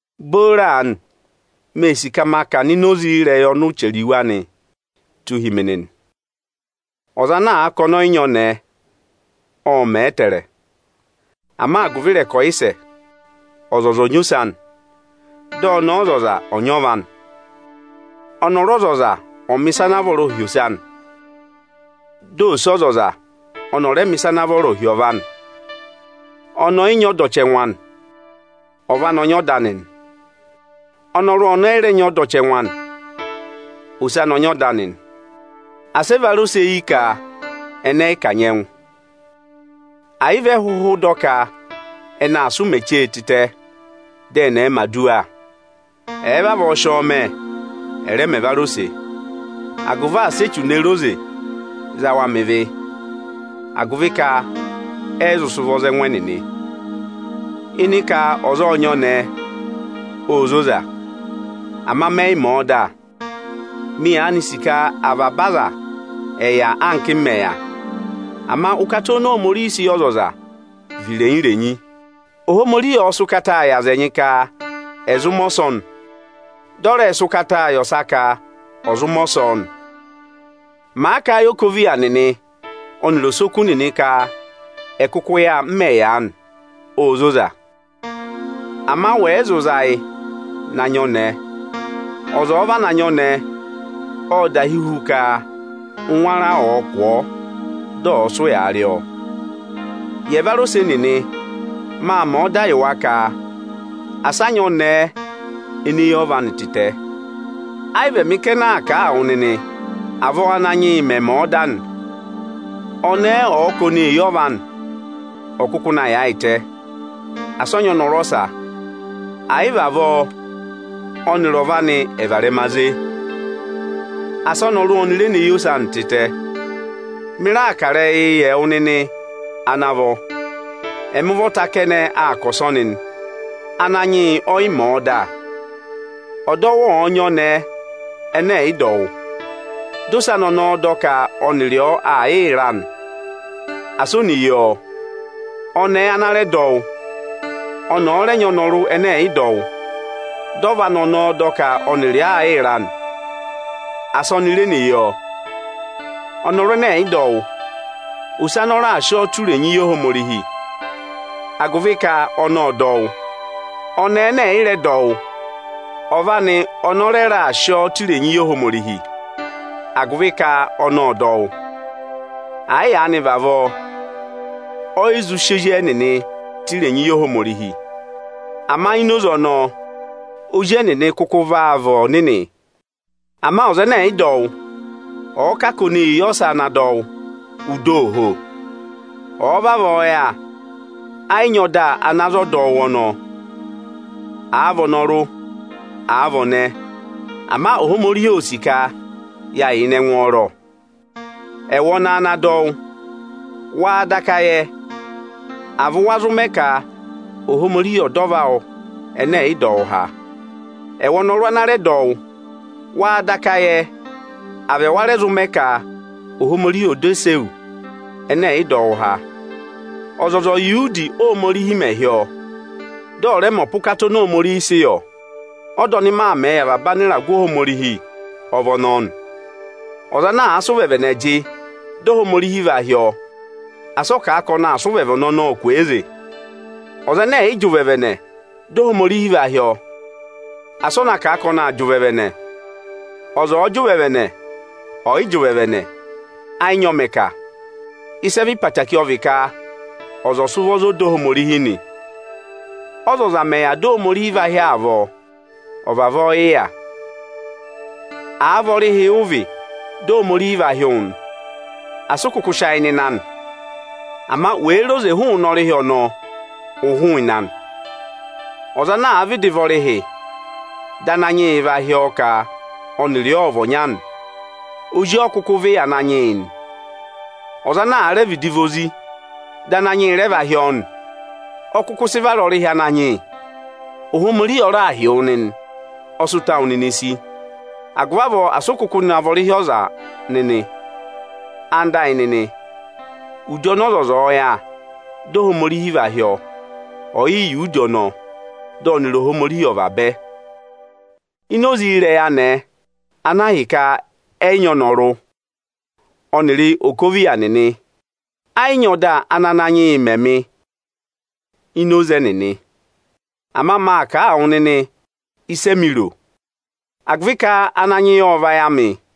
Booro aanị, mee sì ka ma kà ọ̀nọ̀ ini oze ịrẹyị ọnị ụ chẹrẹ iwe anị tụ́ hi mi nịnị. Ọza ana àa ka ọnị ọ yị nyị ọnẹẹ, ọ́ọ mẹẹ ẹtẹẹrẹ. Ama agụvị ịrẹkọyịsẹ, ọzọza ọ̀ nyị ọnẹẹ anị, dị ọnẹẹ ọzọza ọ̀ va ọnọrụ anị. Ọnọrụ ọzọza ọ̀ọ mẹ̀ ịsa ana vọrọọ yị ose anị, dị ọnẹẹ ọzọza ọnị ọ̀ rẹẹ mẹ̀ ịsa ana vọrọọ hi ọva anị. Ọnẹẹ ọ yị nyị ọda ọchẹngụ anị; ọva anị ọ nyị ọda anị. Ọnọrụ ọnị ọ yị rẹ nyị ọda ọchẹngụ anị, ose anị ọ nyị ọda anị nị. Asị ẹvarose yi ka ẹnị ẹ yị kanyị ẹngụ, ẹ̀ yị vị ẹ hụhụ dọ ka ẹnị aa sị ụmẹ chee tịtẹ, dị ẹnị ẹ̀ẹ mẹ̀ aduwa. Ẹ̀ẹ vavọọ sị ọ mẹ, ẹ̀ rẹẹ mẹ ẹvarose ẹnịnị, agụvị asị Echu ne re oze za wa mẹ ịvị, agụvị ka ẹ yị zụ sị ụvọ za ẹngụ ẹnịnị. Ịnị ka ọza ọ̀ nyị ọnẹẹ, óo zoza, ama mẹ yị mẹ̀ ẹ ọda. Mị yaanị sì ka avaba aza ẹ̀ yà anka ẹ́mị mẹ̀ yà. Ama ụkata oni Ohomorihi sị yị ọzọza vị irenyi-irenyi. Ohomorihi ộ sị ụkata yị aza ẹnyị ka ẹ̀ zụ mẹ ọsọnị, dị ọ rẹ sị ụkata yị ọsa ka ẹ̀ zụ mẹ ọsọọ nị. Màa kà a yị okoviya nịnị ọnịrị osoku nịnị ka ẹ̀ kụkụ yà, m mẹ̀ yà aanị, óo zoza. Ama ẹnịnị ẹ̀ yị zụ sị ụvọ za ẹngụ ẹnịnị, ẹ̀ na nyị ọnẹẹ. Ọza ọ̀ọ vana nyị ọnẹẹ, ọ́ọ dahi hu ka ụngwẹ ara ọ̀ọ kụ̀ ọọ, dị ọ̀ọ sị ụyaa rị ọ. Yị ẹvarose nịnị, maa mẹ̀ ọdaa yị wa ka asị a nyị ọnẹẹ ene yi ọva anị tịtẹ. Ẹ yị vị ẹmị kẹnẹ aa kà a wụ nịnị, avọọ Ananyị yị mẹ̀ mẹẹ ọda nị. Ọnẹẹ ọ̀ọ ka ọnị ee yi ọva anị, ọ̀ kụkụ na yaayịtẹ, asị ọ va ọnọrụ ọsa. Ẹ̀ yị vị avọọ, ọnịrị ọva anị ọ̀ varẹma ze. Asị ọnọrụ ọnị re yi ose anị tịtẹ o. Mị raà kà ịrẹyịị yị ẹwụ nịnị ana vọ. Ẹmị ụvọta kẹnẹ aa kà ọsọnị nị. Ananyị yị ọ yị mẹ̀ ẹ ọda: Ọdọwụ ọ̀ọ nyị ọnẹẹ ẹnẹ ẹ̀ yị dọ wụ́, dị ose ọnọọ dọ ka ọnịrị ọ aa yịị ra nị, asị o ne yi ọ. Ọnẹẹ ana rẹ dọ wụ́, ọnị ọ̀ọ rẹ vá ọnọrụ ẹnẹ ẹ̀ yị dọ wụ́, dị ọva anị ọnọọ dọ ka ọnịrị ọ aa yịị ra nị, asị oni re ne yi ọ. Ọnọrụ ẹnẹ ẹ̀ yị dọ wụ́, ose anị ọ raà sị ọ tụ́ irenyi yi Ohomorihi, agụvị ka ọnị ộ dọ wụ́. Ọnẹẹ ẹnẹ ẹ̀ yị dọ wụ́, ọva anị ọnị ọ rẹ raà sị ọ tụ́ irenyi yị Ohomorihi, agụvị ka ọnị ộ dọ wụ́. Ẹ̀ yị vị avọọ, ẹnịnị ẹ yị zụ́ sị ezi ẹnịnị tụ́ irenyi yị Ohomorihi. Ama ọ mẹ yà aanị, ezi ẹnịnị kụkụ vaa vị ọnịnị. Ama ọza ẹnẹ ẹ̀ yị dọ wụ́ ọ̀ọ kà a ka ọnị ee yi ọsa ana dọ wụ́, ụ dọ ooho. Ọ̀ọ vavọọ yà, ẹ yị nyị ọda ana za ọdọwụ ọnọọ, àa vị ọnọrụ, àa vị ọnẹẹ. Ama Ohomorihi óo sì ka yaa yà ịnị ẹngwọọrọ. Ẹwụ ọnẹẹ ana dọ wụ́, wáá daka yẹ, à vị wa zụ mẹ ka Ohomorihi ọ̀ dọ ọva awụ ẹnẹ ẹ̀ yị dọ wụ́ há? Ẹwụ ọnọrụ ana dọ wụ́, wáá daka yẹ, à vị ẹwa rẹ zụ́ mẹ ka Ohomorihi ọ̀ dọ ose ewu ẹnẹ ẹ̀ yị dọ wụ́ há? Ọzọza ọ̀ yà udi ọnị ọ yà, dị Ohomorihi hị́ ọọ, dị ọ̀ rẹ mẹ ọpa ụkata oni Ohomorihi sị yọ! Ọda ọnị maa mẹẹ yị avaba anịragụ Ohomorihi ọ vị ọnọọ nị. Ọza ana àa sị ụvẹvẹnẹ jị dị Ohomorihi vaa hị́ ọọ nị, asị ọ kà a ka ọnị aa sị ụvẹvẹnẹ ọnọọ kwooze! Ọza ẹnẹ ẹ̀ yị jị ụvẹvẹnẹ dị Ohomorihi va hị́ ọọ, asị ọ na kà a ka ọnị aa jị ụvẹvẹnẹ! Ọza ọ̀ọ jị ụvẹvẹnẹ, ọ̀ yị jị ụvẹvẹnẹ, ẹ yị nyị ọ mẹ̀ kà. Ịsị ẹ vị ịrẹyị obooro ọ vị ka ọza ọ̀ sị ụvọ za ọda Ohomorihi nị. Ọzọza mẹ̀ yà dị Ohomorihi va hị́ ọọ avọọ, ọ̀ vavọọ yị yà. Àa vị ọrịhị ụ vị dị Ohomorihi va hị́ wụ nị, asị ụ kụkụ sị ayị nọ ịnị anị. Ama wèe re oze hụụnị ọrịhị ọnọọ, ụ hụụnị anị. Ọza ana àa vịdị vị ọrịhị dị Ananyị yị va hị́ ọọ ka ọnịrị ọ ọ̀ vị ọnya nị, ozi ọ kụkụ vị yị Ananyị yị nị. Ọza ana àa rẹ vị ozi dị Ananyị yị va hị́ ọọ nị, ọ kụkụ sị vara ọrịhị Ananyị yị. Ohomorihi ọ raà hị́ wụ nịnị, ọ sị ụta awụ nịnị sí; agụvị avọọ asị ụ kụkụ na vị ọrịhị ọza nịnị. Ẹwụ nịnị ẹyịnyara amị, udi ọnị ọzọza yà, dị Ohomorihi va hị́ ọọ, ọ̀ yị yà udi ọnọọ, dị ọnịrị Ohomorihi ọ̀ vabẹ! Ini oze ịrẹyị anẹẹ, ana ahịka ẹ̀ yị nyị ọnọrụ, ọnịrị okoviya nịnị, ẹ yị nyị ọda ana Ananyị yị mẹ mị ini oze ẹnịnị. Ama maa kà a wụ nịnị ịsị emi ro. Wa zụ sị ayị tụra mị nịnị agụvị ka, Ananyị yị ộ vayị amị.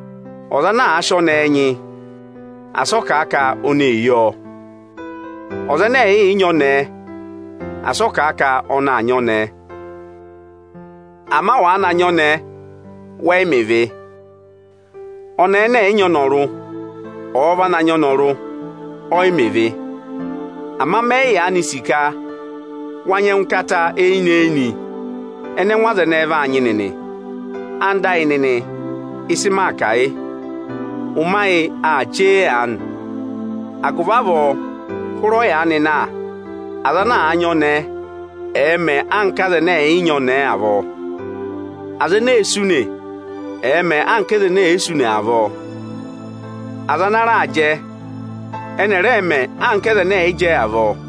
Ọza ana àa sị ọnẹẹ nyị, asị ọ kà ka ọnị ee yi ọọ. Ọza ẹnẹ ẹ̀ yị nyị ọnẹẹ, asị ọ kà ka ọnị aa nyị ọnẹẹ. Ama wàa na nyị ọnẹẹ, wẹ yị mẹ ịvị. Ọnẹẹ ẹnẹ ẹ̀ yị nyị ọnọrụ, ọ̀ọ na va ọnọrụ, ọ yị mẹ ịvị. Ama mẹ yị yaanị sì ka wáa nyị ẹngụkata eyinị-eyinị ẹnẹ ẹngụ aza ẹnẹẹ vaa nyị nịnị. Ẹwụ nịnị ẹyịnyara amị, ịsị máa kà, yị: Ụmẹ ayị aa chee aanị. Agụvị avọọ, hụrị ọyaanị na, aza ana nyị ọnẹẹ, ẹ̀ẹ mẹ anka aza ẹnẹ ẹ̀ yị nyị ọnẹẹ avọọ. Aza ene èe sú ùnè, ẹ̀ẹ mẹ anka aza ene è yi sú ùnè avọọ. Aza ana raa jẹ, ẹ̀ẹ mẹ anka aza ẹnẹ ẹ̀ yị jẹ avọọ!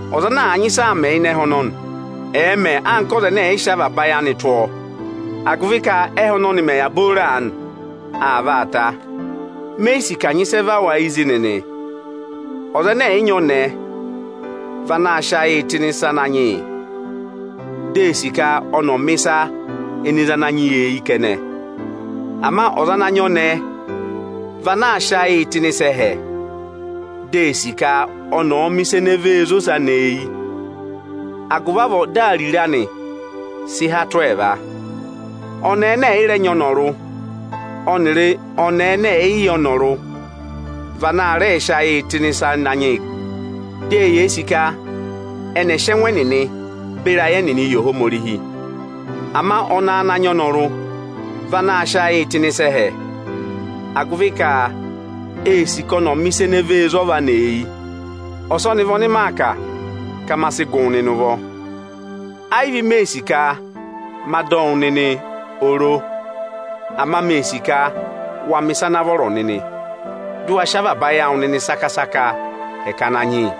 Ọza ana àa nyị ịsa aa mẹ ịnị ẹhẹ ọnọnị, ẹ̀ẹ mẹ anka ọza ẹnẹ ẹ̀ yị sị avaba ayị anị tụ́ ọọ! Agụvị ka ẹhẹ ọnọnị mẹ̀ yà booro aanị, aa vaa ta. Me yi sì ka à nyị ịsị ẹ và wụ ayị zi nịnị. Ọza ẹnẹ ẹ̀ yị nyị ọnẹẹ, vị anaā sịị ayịị tụ́ ịnị ịsa Ananyị yị. Vị eē sì ka ẹnị ẹ̀ẹ mẹ̀ ịsa ene zé Ananyị yị eyi kẹnẹ nị. Ama ọza ana nyị ọnẹẹ, vị anaā sịị ayịị tụ́ ịnị ịsa ẹhẹ, dị ee sì ka ọnị ọ̀ọ mẹ̀ ịsa ene zé ose anị eyi; agụvị avọọ, dị ariro anị sị há hi ẹẹva. Ọnẹẹ ẹnẹ ẹ̀ yị rẹ nyị ọnọrụ, ọnịrị ẹnẹ ẹ̀ yị yẹ ọnọrụ da vị ana rẹẹ̄ sị ayịị tụ́ ịnị ịsa Ananyị yị. Ẹnịnị vị eneē sì ka ẹnị ẹ̀ sị ẹngụ ẹnịnị beri ayị ẹnịnị yị Ohomorihi. Ama ọnẹẹ ana nyị ọnọrụ, vị anaā sịị ayịị tụ́ ịnị ịsa ẹhẹ, agụvị ka ee sì ka ọnị ọ̀ọ mẹ̀ ịsa ene zé ọva anị eyi. Ọsọnị vị ọnị maa kà, ka ma sị gụ wụ nịnị ụvọ. Ẹ yị vị mee sì ka ma dọ wụ nịnị oro. Ama mee sị ka wa mẹ̀ ịsa ana vọrọ nịnị, dị ụ waa sị avaba ayị awụ nịnị saka-sakaa hẹkẹ Ananyị yị.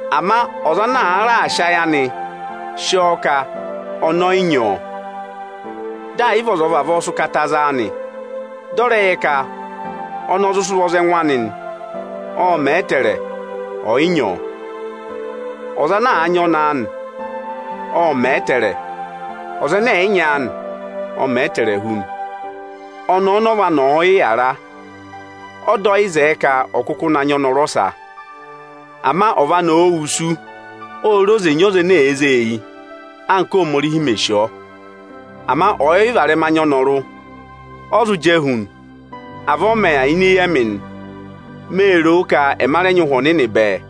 Ama ọza ọ̀ọ raà sị ayị anị sị ọọ ka ọnị ọ yị nyị ọnẹẹ, dị ẹ̀ yị vị ọza ọ vavọọ sị ụkata za a nị; ọ̀ọ rẹ yẹ ka ọnị ọ zụ sị ụvọ za ẹngụ nị, ọ́ọ mẹ̀ ẹ ẹtẹẹrẹ, ọ̀ yị nyị ọ. Ọza ana nyị ọnẹẹ anị, ọ́ọ mẹ̀ ẹ ẹtẹẹrẹ. Ọza ẹnẹ ẹ̀ yị nyị aanị, ọ́ọ mẹ̀ ẹ ẹtẹẹrẹ hu nị. Ọnẹẹ ọnị ọva anị ọ̀ọ yị yàra, ọda ọ yị zẹ ẹ ka ọ̀ kụkụ na va ọnọrụ ọsa. Ama ọva anị òo wusu, óo re oze na va ọza ene zé eyi anka Ohomorihi mè sì ọọ. Ama ọ̀ yị varẹma nyị ọnọrụ, ọ́ zụ jẹẹ hu nị. Avọọ ọ mẹ̀ yà ini eyi ẹmị nị. Mee ro ka ẹma rẹ nyị Ụhwẹ Ohomorihi bẹẹ.